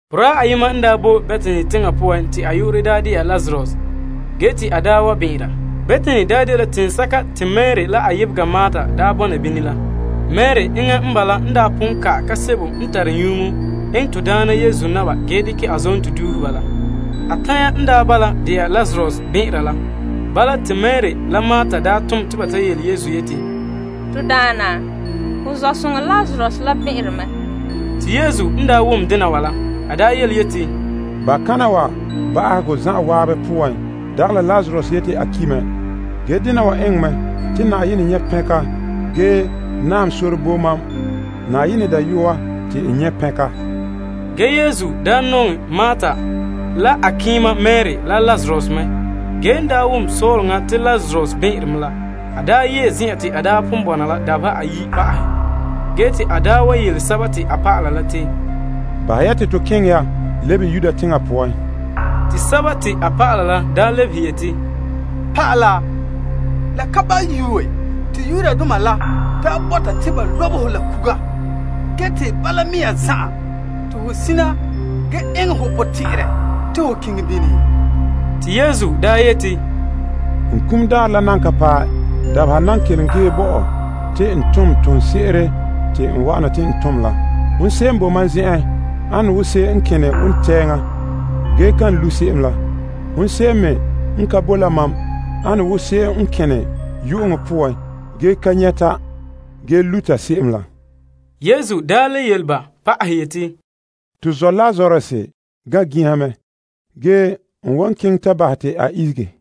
Boraa ayema n daa boe Betani teŋa poan te a yu'urɛ dɛna Lazarus ge daa bɛn'ɛnra. Betani dela teŋsɛka te Mari la a yebega Marta bɔna bini la. Mari enŋa n bala pon ka'ɛ kaam sebo n tare nyuŋo eŋɛ to Daana Yesu na'ma ge dekɛ a zonto duuhe ba la. A tanya n bala de'a Lazarus bɛn'ɛnra la. Bala, te Mari la Marta tom te ba yele Yesu yeti, To Daana, ho zɔ'soŋa Lazarus la bɛn'ɛnre mɛ. Te Yesu n wom dena wa la, a yeti, Ban'a kana wa ba'ahegɔ zan'an poan dagɛ la Lazarus yeti a ki' mɛ. Ge dena wa eŋɛ mɛ te Na'ayenɛ nyɛ' pɛnka ge naam sore bo Na'ayenɛ Dayɔa te n nyɛ' pɛnka. Ge Yesu nɔŋɛ Marta la a keema Mari la Lazarus mɛ. Ge la en daa wom sɔɔleŋa la te Lazarus bɛn'ɛnre me la, a yee zen'en ta pon bɔna la dabeha ayi' pa'ahɛ. Ge te a yele a dɔlɔba la te, Bahɛ ya te to keŋɛ ya lebe Yudea teŋa poan. Te a dɔlɔba la lebehe yeti, Naa, la ka ba yuue te Yudoma la bɔta te ba lobe ho la kuga. Ge, te bala mea zan'an te ho sina ge eŋɛ ho potɛn'ɛrɛ te ho keŋɛ bini? Te Yesu yeti, Dabeha nan kelom ge bo mam te n tom toonse'ere te n wa'ana te n tom la. Hon se'em n boe mam zen'en ane wo se'em n kene wontɛŋa ge kan lu' se'em la. Hon se'em me n ka bo la mam ane wo se'em n kene yu'uŋɔ poan ge ka nyɛta ge luta se'em la. Yesu le yele ba pa'ahɛ yeti, To zɔ' Lazarus gan' ginha mɛ. Ge, n wan keŋɛ ta bahɛ te a ihege.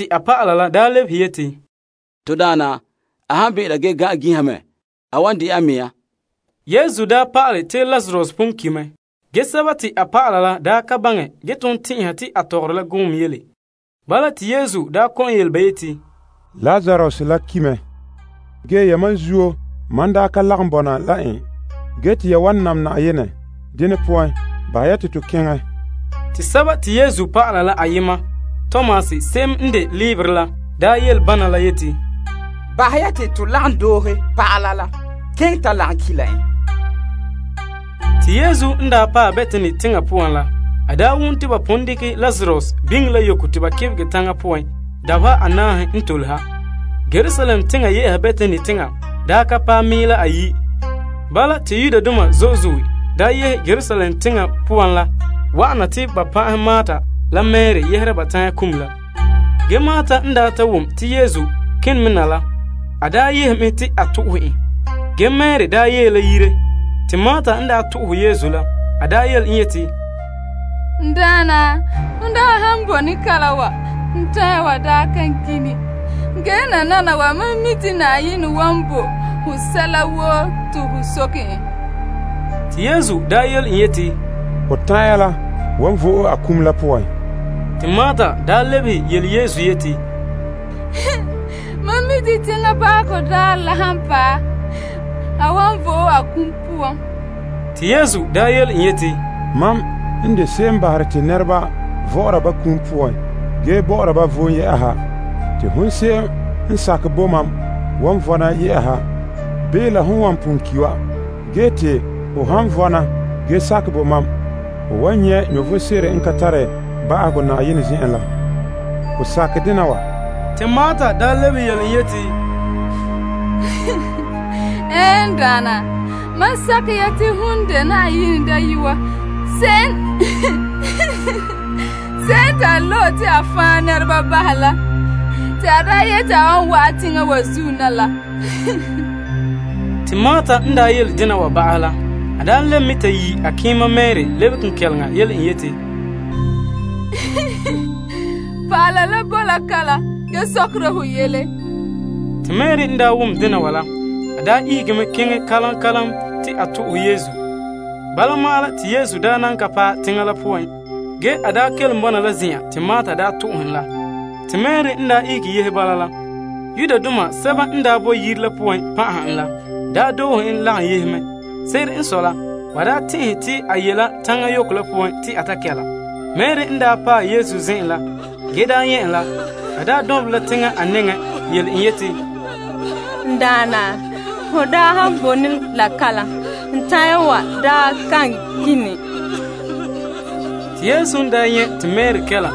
A dɔlɔba la lebehe yeti, To Daana, a han bɛn'ɛnra ge gan'an ginha mɛ, a wan de'a a mea. Yesu pa'ale te Lazarus pon ki' mɛ, ge, a dɔlɔba la daa ka baŋɛ ge ton tɛn'ɛha te a tɔgɔre la gɔɔm yele. Bala, te Yesu daa kɔ'ɔn yele ba yeti, Lazarus la ki' mɛ. Ge, yamam zuo la sontii mam daa ka lagom bɔna la en. Ge te ya wan nam Na'ayenɛ. Dene poan, bahɛ ya te to keŋɛ ya. Te Yesu dɔlɔba la ayema Tomas se'em n de leebere la daa yele bana la yeti, Bahɛ ya te to lagom doohe pa'ala la keŋɛ ta lagom ki' la en. Te Yesu n paɛ Betani teŋa poan la, a wom te ba pon dekɛ Lazarus biŋe la yoko te ba kebegɛ taŋa poan dabeha anaahe n tole ha. Yerusalem teŋa ye'a Betani teŋa daa ka paɛ mɛɛla ayi'. Bala, te Yudoma zo'e zo'e daa yehe Yerusalem teŋa poan la wa'ana te ba pan'ahɛ Marta la Mari yɛhera ba tanya kum la. Ge Marta n ta wom te Yesu kene me na la, a yehe mɛ te a to'ohɛ en. Ge, Mari yee la yire. Te Marta yele Yesu yeti, N Daana, hon bone kalam wa, n tanya wa kan kini. Ge, nananawa mam mi' te Na'ayenɛ wan bo ho sɛla woo te ho soke en. Te Yesu yele en yeti, Ho tanya la wan vo'e a kum la poan. Te Marta lebehe yele Yesu yeti, Mam mi' te teŋa ba'ahegɔ daarɛ la han paɛ, a wan vo'e a kum la poan. Te Yesu yele en yeti, Mam de se'em n bahere te nɛreba vɔ'ɔra ba kum poan ge bɔ'ɔra ba vom. Te hon se'em n sakɛ bo mam wan vɔna bii la hon wan pon ki' wa. Ge te ho han vɔna ge sakɛ bo mam, ho wan nyɛ' vom sebo n ka tare ba'ahegɔ Na'ayenɛ zen'en la. Ho sakɛ dena wa? Te Marta lebehe yele en yeti, Ɛɛn, n Daana. Mam sakɛ ya te ho dela Na'ayenɛ Dayɔa, se'em te a loe te a fan' nɛreba bahɛ tom en teŋa wa zuo na la. Te Marta n daa yele dena wa ba'ahɛ la, a lebe mɛ ta yi' a keema Mari lebe kenkɛleŋa yele en yeti, Pa'ala la boe la kalam ge sɔkera ho yele. Te Mari n daa wom dena wa la, a ihege keŋɛ kalam kalam te a to'ohɛ Yesu. Bala ma'an la, te Yesu daa nan ka paɛ teŋa la poan. Ge, a kelom bo la zen'an te Marta to'ohɛ en la. Te Mari n daa ihege yehe bala la, Yudoma sɛba n daa boe yire la poan pan'aha en la daa doohe en lagom yehe mɛ. Se'ere n sɔe la, ba tɛn'ɛhe te a ye la taŋa yoko la poan te a ta kɛla. Mari n daa paɛ Yesu zen'en la, ge nyɛ' en, a dɔnbelɛ a nɛŋa yele en yeti, N Daana, ho daa han bone la kalam, n tanya wa kini. Te Yesu n nyɛ' te Mari kɛla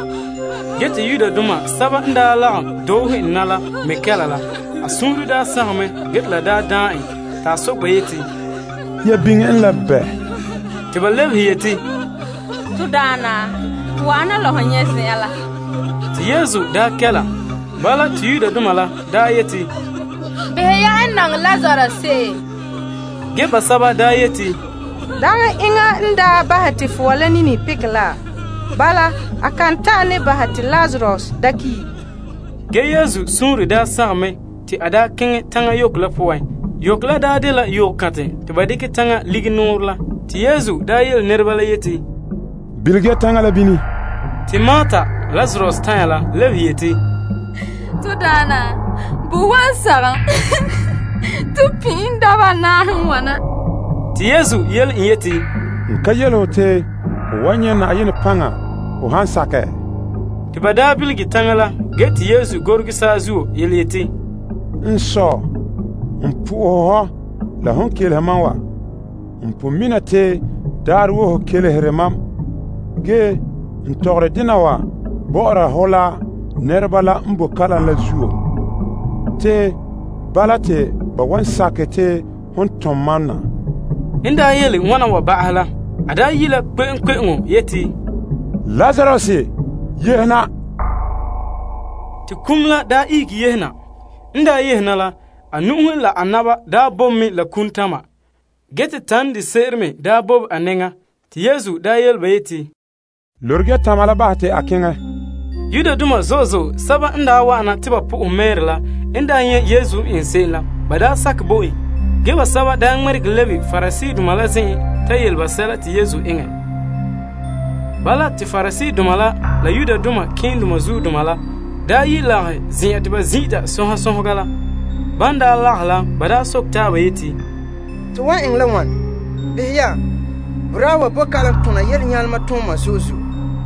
ge te Yudoma sɛba n daa lagom doohe en na la daa me kɛla la, a suunre daa sagom mɛ, ge te la daan en ta soke ba yeti, Ya biŋe en la bɛɛ? Te ba lebehe yeti, To Daana, wa'ana la ho nyɛ' zen'en la. Te Yesu kɛla. Bala, te Yudoma la yeti, Behɛ ya n nɔŋɛ Lazarus se'em. Ge, basɛba yeti, Dagɛ enŋa n daa bahɛ te fɔa la nini pekɛ la? Bala, a kan ta'an ne bahɛ ne te Lazarus da ki'? Ge Yesu suunre daa sagom mɛ te a keŋɛ taŋa yoko la poan. Yoko la daa dela yokantɛ te ba dekɛ taŋa lige nɔɔrɛ la. Te Yesu yele nɛreba la yeti, Bilige ya taŋa la bini. Te Marta, Lazarus tanya la lebehe yeti, To Daana, bo wan sagom, ton pin' en dabeha anaahe n wana. Te Yesu yele en yeti, N ka yele ho te ho wan nyɛ' Na'ayenɛ paŋa, ho han sakɛ? Te ba bilige taŋa la ge te Yesu gore ge saazuo yeti, N Sɔ, n po'ohɛ hɔ la hon kelehe mam wa. N pon mi' te daarɛ woo ho kelehere mam, ge n tɔgɔre dena wa bɔ'ɔra hɔ la nɛreba la n bo kalam la zuo: te bala te ba wan sakɛ te hon tom mam na. N yele wana wa ba'ahɛ la, a daa yi' la kpe'eŋkpe'eŋo yeti, Lazarus, yehe na. Te a ihege yehe na. N daa yehe na la, a nu'uhe la a na'ma daa bobe mɛ la kumtama, ge te tan de se'ere me daa bobe a nɛŋa. Te Yesu yele ba yeti, Lorege ya tama la bahɛ ta keŋɛ. Yudoma zo'e zo'e sɛba n daa wa'ana te ba po'ohɛ Mari la n nyɛ' Yesu n eŋɛ se'em la, ba sakɛ bo en. Ge, basɛba ŋmɛregɛ lebe Pariseedoma la zen'en ta yele ba sɛla te Yesu enŋɛ. Bala, te Pariseedoma la la malema keema la yi' lagahɛ la Yetɔgom Tɔgɔrɔba la. Ban lagahɛ la ba soke taaba yeti, To wan eŋɛ la wane? Behɛ ya, boraa wa bo kalam tona yelenyalema tooma zo'e zo'e.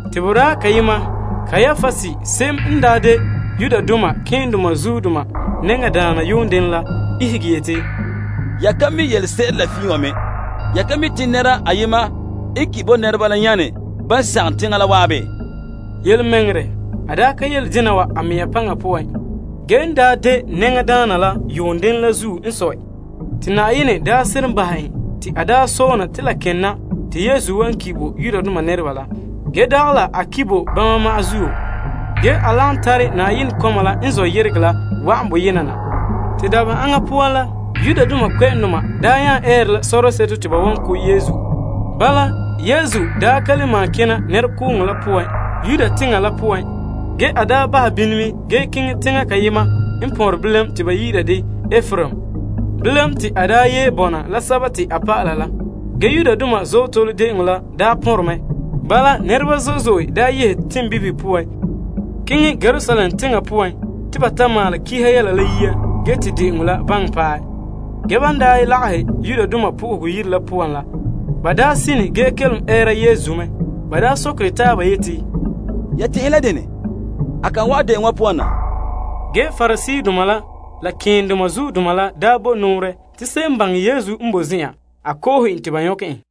Te boraa kayema Kaiapas se'em n daa de malema nɛŋadaana yuun denɛ la ihege yeti, Ya ka mi' yelese'ere la fiin wa me. Ya ka mi' te nɛra ayema n ki' bo nɛreba la yaane ban sagom teŋa la waabe? Yelemɛŋɛrɛ, a daa ka yele dena wa la a mea paŋa poan. Ge, n daa de nɛŋadaana la yuun denɛ la zuo n sɔe te Na'ayenɛ seren bahɛ en te a daa sɔɔlena te la ken na te Yesu wan ki' bo Yudoma nɛreba la. Ge dagɛ la a ki' bo ba ma'an zuo. Ge, a lagom tare Na'ayenɛ kɔma la n zɔ' yeregɛ la wa'an bɔberɛ yenɛ na. Te dabeha aŋa poan la, Yudoma daa nya eere la sɔrɔtɔ te ba wan ko' Yesu. Bala, Yesu ka le malom kena nɛrekooŋɔ la poan Yudea teŋa la poan. Ge, a bahɛ bini mɛ ge keŋɛ teŋa kayema n pɔnrɛ pɔgɔtia te ba yi'ira ka Epraim. Bilam, te a yee bɔna la a dɔlɔba la. Ge Yudoma Azootole De'eŋɔ la pɔnrɛ mɛ. Bala, nɛreba zo'e zo'e daa yehe teŋbibihe poan keŋɛ Yerusalem teŋa la poan te ba ta maalɛ duuhego malema yɛla la yia ge te de'eŋɔ la baŋɛ paɛ. Ge ban lagahɛ Yenɛ Yire la poan la, ba sine ge kelom ɛɛra Yesu mɛ. Ba sokere taaba yeti, Ya tɛn'ɛhe la dene? A kan wa'an de'eŋɔ wa poan na? Ge Pariseedoma la, la malema keendoma la bo nɔɔrɛ te se'em n baŋɛ Yesu n bo zen'an a ko'ohe te ba nyɔkɛ en.